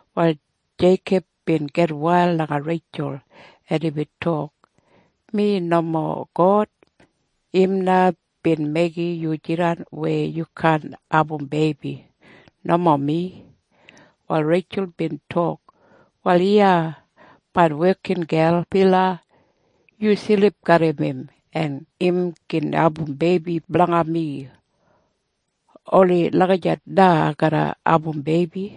Wal Jeikob bin gitwail langa Reitjul, en imbin tok, “Mi nomo God! Im na bin meigim yu jidan weya yu kaan abum beibi. Nomo mi.” Wal Reitjul bin tok, “Wal iya main wekingel Bila. Yu silip garram im, en im gin abum beibi blanga mi. Oni lagijat na ai garra abum beibi.”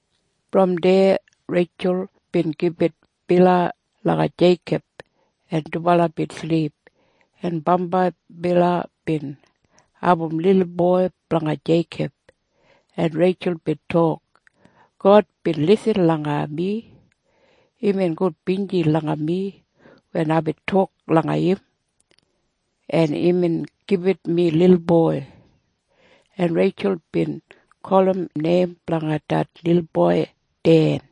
Brom deya Reitjul bin gibit Bila langa Jeikob, en dubala bin silip, en bambai Bila bin abum lilboi blanga Jeikob, en Reitjul bin tok, “God bin lisin langa mi. Imbin gudbinji langa mi wen aibin tok langa im, en imbin gibit mi lilboi.” En Reitjul bin gulum neim blanga det lilboi Den.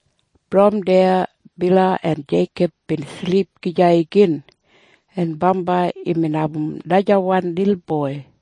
Brom deya Bila en Jeikob bin silip gija igin, en bambai imbin abum najawan lilboi,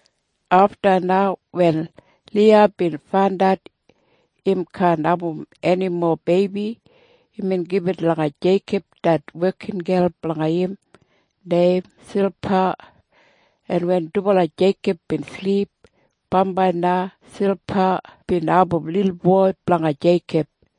Afta na wen Liya bin faindat im kaan abum enimo beibi, imbin gibit langa Jeikob det wekingel blanga im neim Silpa, en wen dubala Jeikob bin silip, bambai na Silpa bin abum lilboi blanga Jeikob,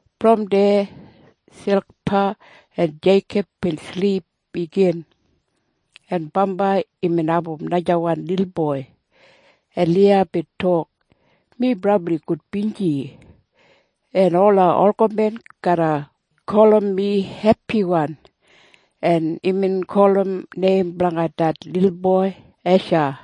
Brom deya Silpa en Jeikob bin silip igin, en bambai imbin abum najawan lilboi, en Liya bin tok, “Mi brabli gudbinji. En ola olgamen garra gulum mi hepiwan.” En imbin gulum neim blanga det lilboi Esha.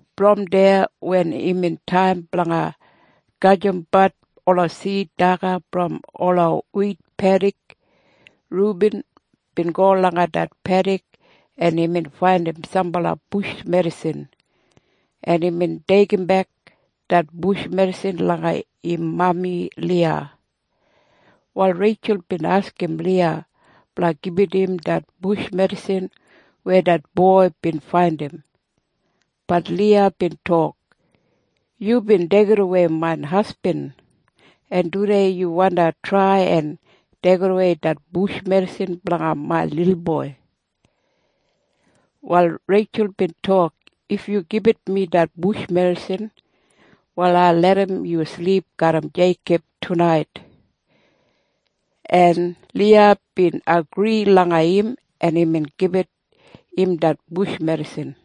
Brom deya wen imbin taim blanga gajimbat ola sid daga brom ola wit pedik, Rubin bin go langa det pedik, en imbin faindim sambala bush medisin, en imbin deigimbek det bush medisin langa im mami Liya. Wal Reitjul bin askim Liya blanga gibit im det bush medisin weya det boi bin faindim. Bat Liya bin tok, “Yubin deigidawei main hasbin, en tudei yu wandi trai en deigidawei det bush medisin blanga main lilboi.” Wal Reitjul bin tok, “If yu gibit mi det bush medisin, wal ai larram yu silip garram Jeikob tunait.” En Liya bin agri langa im, en imbin gibit im det bush medisin.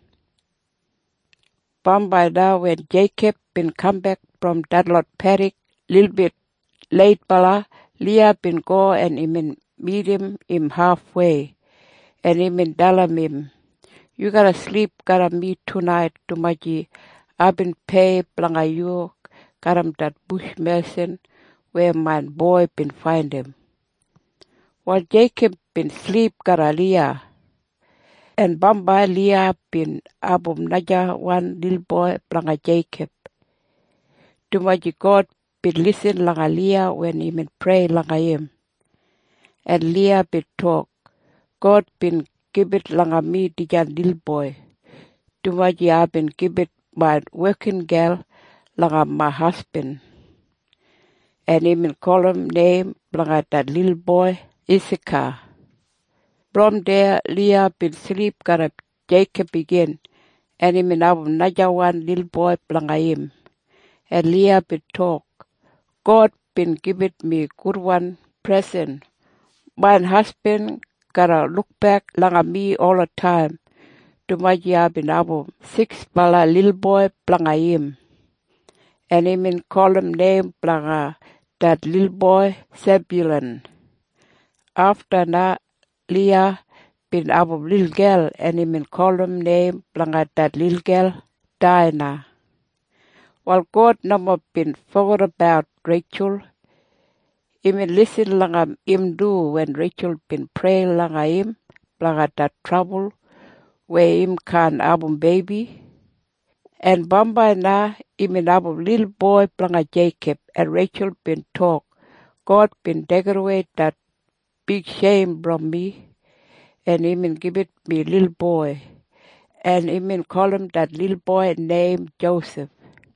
Bambai na wen Jeikob bin kambek brom detlot pedik lilbit leitbala, Liya bin go en imbin midim im hafwei, en imbin dalim im, “Yu garra silip garram mi tunait, dumaji aibin pei blanga yu garram det bush medisin weya main boi bin faindim.” Wal Jeikob bin silip garram Liya, en bambai Liya bin abum najawan lilboi blanga Jeikob, dumaji God bin lisin langa Liya wen imbin prei langa im. En Liya bin tok, “God bin gibit langa mi dijan lilboi, dumaji aibin gibit main wekingel langa main hasbin.” En imbin gulum neim blanga det lilboi Isaka. Brom deya Liya bin silip garram Jeikob igin, en imbin abum najawan lilboi blanga im, en Liya bin tok, “God bin gibit mi gudwan presen. Main hasbin garra lukbek langa mi olataim, dumaji aibin abum siksbala lilboi blanga im.” En imbin gulum neim blanga det lilboi Sebyulan. Afta na Liya bin abum lilgel, en imbin gulum neim blanga det lilgel Daina. Wal God nomo bin fogedabat Reitjul. Imbin lisin langa im du wen Reitjul bin prei langa im blanga det trabul weya im kaan abum beibi. En bambai na imbin abum lilboi blanga Jeikob, en Reitjul bin tok, “God bin deigidawei det bigsheim brom mi, en imbin gibit mi lilboi.” En imbin gulum det lilboi neim Josef.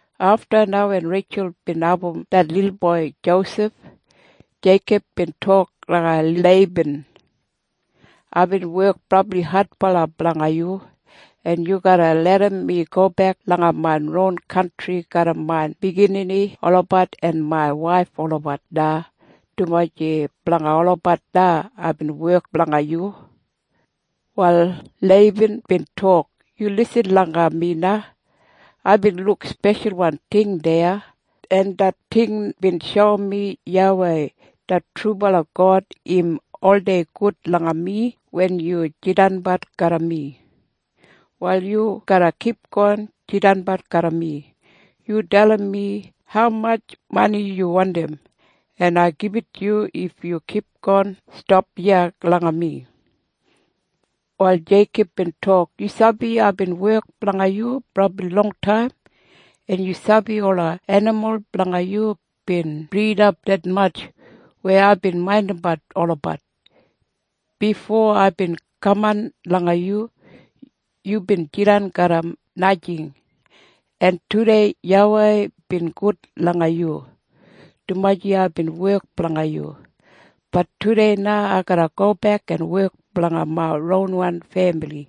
Afta na wen Reitjul bin abum det lilboi Josef, Jeikob bin tok langa Leiban, “Aibin wek brabli adbala blanga yu. En yu garra larram mi gobek langa main ron kantri garram main biginini olabat en main waif olabat na, dumaji blanga olabat na aibin wek blanga yu.” Wal Leiban bin tok, “Yu lisin langa mi na. Aibin luk speshalwan ting deya, en det ting bin shoum mi YAWEI det trubala God im oldei gud langa mi wen yu jidanbat garram mi. Wal yu garra kipgon jidanbat garram mi. Yu dalim mi haumatj mani yu wandim, en ai gibit yu if yu kipgon stap iya langa mi.” Wal Jeikob bin tok, “Yu sabi aibin wek blanga yu brabli longtaim, en yu sabi ola enimul blanga yu bin bridap detmatj weya aibin maindimbat olabat. Bifo aibin kaman langa yu, yubin jidan garram najing, en tudei YAWEI bin gud langa yu, dumaji aibin wek blanga yu. Bat tudei na ai garra gobek en wek blanga main ronwan femili.”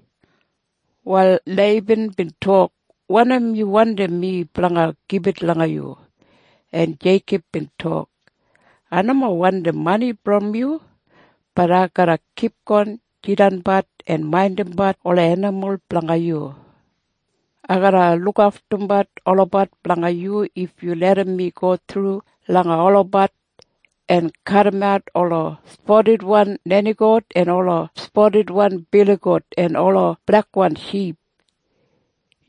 Wal Leiban bin tok, “Wanim yu wandim mi blanga gibit langa yu?” En Jeikob bin tok, “Ai nomo wandim mani brom yu. Bat ai garra kipgon jidanbat en maindimbat ola enimul blanga yu. Ai garra lukaftumbat olabat blanga yu if yu larram mi go thru langa olabat en kadimat ola spadidwan nenigout en ola spadidwan biligout en ola blekwan ship.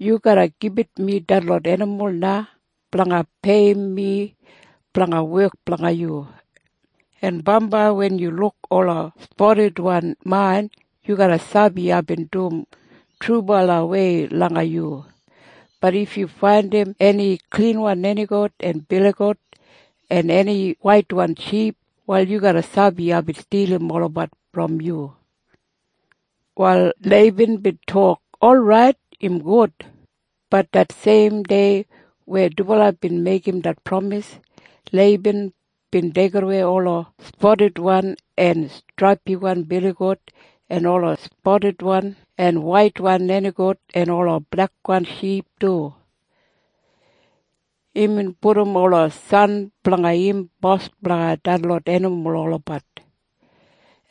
Yu garra gibit mi detlot enimul na blanga peiyim mi blanga wek blanga yu. En bambai wen yu luk ola spadidwan main, yu garra sabi aibin dum trubalawei langa yu. Bat if yu faindim eni klinwan nenigout en biligout en eni waitwan ship, wal yu garra sabi aibin stilim olabat brom yu.” Wal Leiban bin tok, “Orait. Im gud.” Bat det seim dei weya dubala bin meigim det pramis, Leiban bin deigimwei ola spadidwan en straipiwan biligout en ola spadidwan en waitwan nenigout en ola blekwan ship du. Imbin pudum ola san blanga im bos blanga detlot enimul olabat,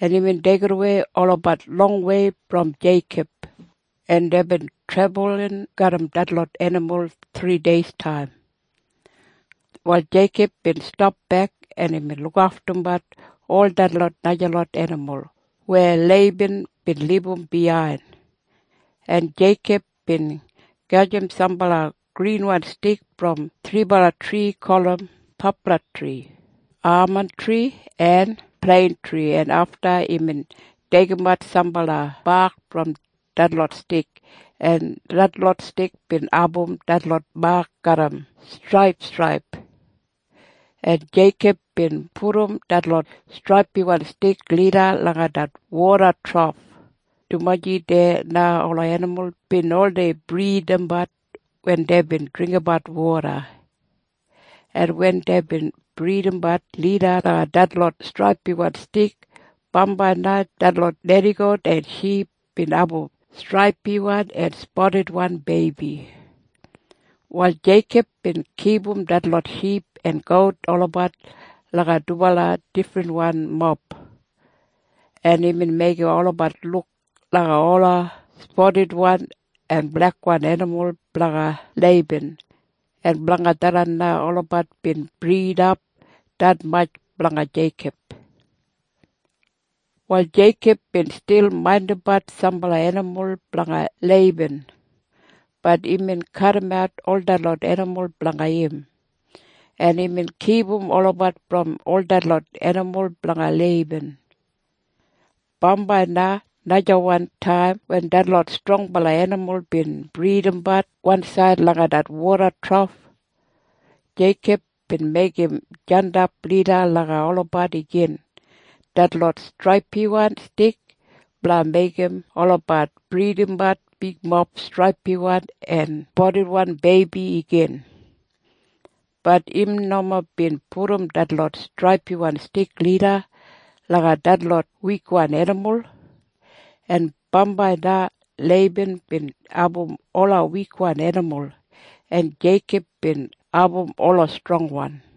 en imbin deigidawei olabat longwei brom Jeikob, en deibin trebulin garram detlot enimul thrideistaim. Wal Jeikob bin stapbek, en imbin lukaftumbat ol detlot najalot enimul weya Leiban bin libum biyain, en Jeikob bin gajim sambala grinwan stik brom thribala tri gulum paplatri, amantri en pleintri, en afta imbin deigimat sambala bak brom detlot stik, en detlot stik bin abum detlot mak garram straipstraip, en Jeikob bin pudum detlot straipiwan stik lida langa det woda trof, dumaji deya na ola enimul bin oldei bridabat wen deibin dringgimbat woda, en wen deibin bridabat lida langa detlot straipiwan stik, bambai na detlot nenigout en ship bin abum straipiwan en spadidwan beibi. Wal Jeikob bin kipum detlot ship en gout olabat langa dubala difrinwan mob, en imbin meigim olabat luk langa ola spadidwan en blekwan enimul blanga Leiban, en blanga tharran na olabat bin bridap detmatj blanga Jeikob. Wal Jeikob bin stil maindimbat sambala enimul blanga Leiban. Bat imbin kadimat ol detlot enimul blanga im, en imbin kipum olabat brom ol detlot enimul blanga Leiban. Bambai najawan taim wen detlot strongbala enimul bin bridabat wansaid langa det woda trof, Jeikob bin meigim jandap lida langa olabat igin detlot straipiwan stik blanga meigim olabat bridimap bigmob straipiwan en spadidwan beibi igin. Bat im nomo bin pudum detlot straipiwan stik lida langa detlot wikwan enimul. En bambai na Leiban bin abum ola wikwan enimul, en Jeikob bin abum ola strongwan.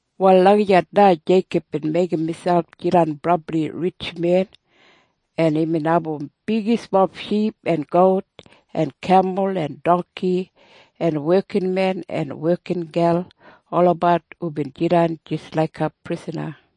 Wal lagijat na Jeikob bin meigim miselp jidan brabli ritjmen, en imbin abum bigismob ship en gout en kemul en dongki en wekinmen en wekingel olabat hubin jidan jis laiga prisana.